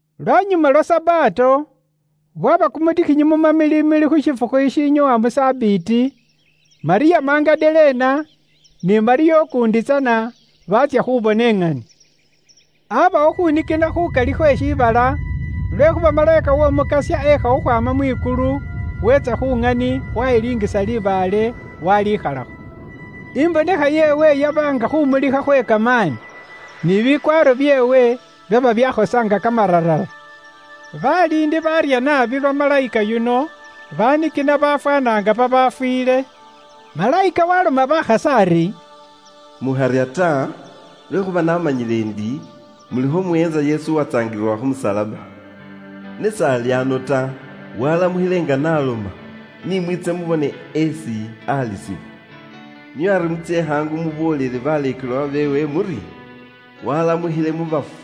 Lwanyuma lwa Sabato, bwaba kumutikhinyi mu mamilimili khu shifukhu shishinyoowa mu sabiiti, Malyamu Magadalena, ni Malyamu ukuundi tsana, baatsya khubona iŋani. Aabawo khuunikina khukali khwe shiibala, lwekhuuba malayika w'Omukasya ekha khukhwaama mwikulu, weetsa khu ŋani waayilingisa libaale, waalikhalakho. Imbonekha yeewe yaba nga khuumulikha khwe kamaani, ni bikwaaro byeewe byaba byakhosa nga kamararara. Baliindi baarya naabi lwa malayika yuno, banikina bafwaana nga babafwiile. Malayika waaloma bakhasi ari, “Mukharya ta, lwekhuuba naamanyile ndi, mulikho muweentsa Yesu isi baatsaangilila khu musalaba. Ne s'ali ano ta, waalamukhile nga n'aloma. Ni mwiitse mubone esi alisibwa. Nio ari mutsye khaangu muboolele baleekelwa beewe muri, ‘Waalamukhile mu bafu,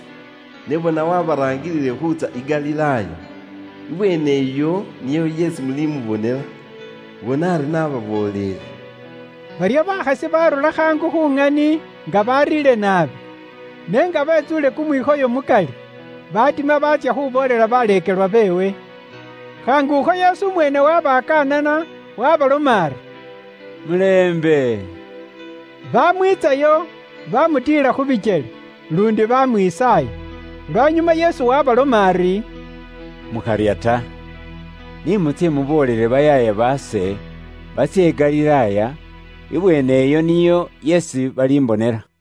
ne bona waabaraangilile khuutsya i Galilaaya. Ibweene iyo niyo yeesi mulimubonela.’ Bona ari naababooleele.” Baryo bakhasi baarura khaangu khu ŋani nga bariire naabi, ne nga betsuule kumwikhoyo mukali, baatima baatsya khuuboolela baleekelwa beewe. Khaangukho Yesu umweene waabakanana, waabaloma ari, “Mulembe.” Baamwiitsayo, baamutiila khu bikyele, luundi baamwisaaya. Lwanyuma Yesu waabaloma ari, “Mukharya ta. Ni mutsye muboolele bayaaya baase, batsye i Galilaaya, ibweene iyo niyo yeesi balimbonela.”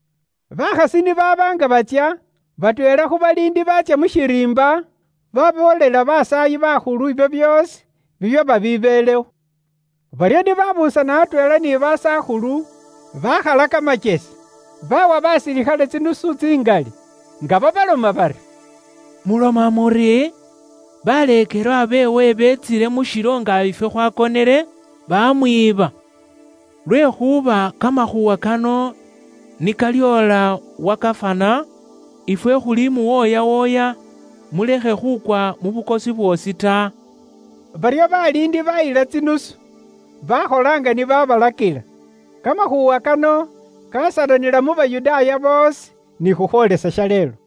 Bakhasi ni baaba nga batsya, batweela khu baliindi baatsya mu shiriimba, baboolela basaayi bakhulu ibyo byoosi bibyaba byabelewo. Baryo ni babuusana atweela ni basakhulu bakhala kamakyesi, baawa basilikhale tsinusu tsingali, nga babaloma bari, “Muloma muri, ‘Baleekelwa beewe beetsile mu shilo nga ifwe khwakonele, bamwiiba.’ Lwekhuuba kamakhuuwa kano ni kalyoola wa gafana, ifwe khulimuwooyawooya, mulekhe khukwa mu bukosi bwoosi ta.” Baryo baliindi bayila tsinusu, bakhola nga ni babalakila. Kamakhuuwa kano kasalanila mu Bayudaaya boosi, ni khukhwoolesa shaleelo.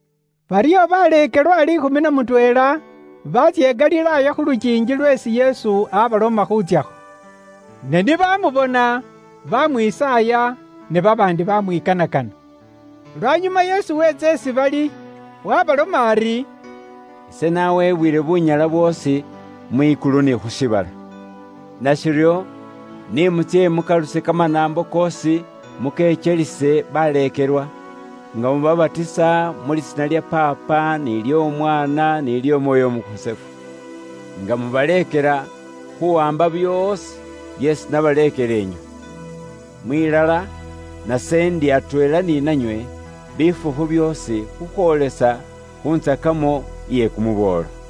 Baryo baleekelwa liikhumi na mutweela baatsya i Galilaaya khu lukiingi lweesi Yesu abaloma khuutsyakho. Ne ni baamubona, baamwisaaya, ne babaandi baamwikanakana. Lwanyuma Yesu weetsa isi bali, waabaloma ari, “Ise nawebwile bunyala bwoosi, mwikulu ni khu shiibala. Nashiryo, ni mutsye mukaluse kamanaambo koosi mukekyelise baleekelwa, nga mubabatisa mu Lisiina lya Paapa nily'Omwaana, nily'Omwooyo Umukhosefu. Nga mubaleekela khuuwaamba byoosi byeesi nabalakila inywe. Mwilala, nase ndi atweela ni nanywe, bifukhu byoosi khukhwoolesa khu ntsakamo iye kumuboolo.”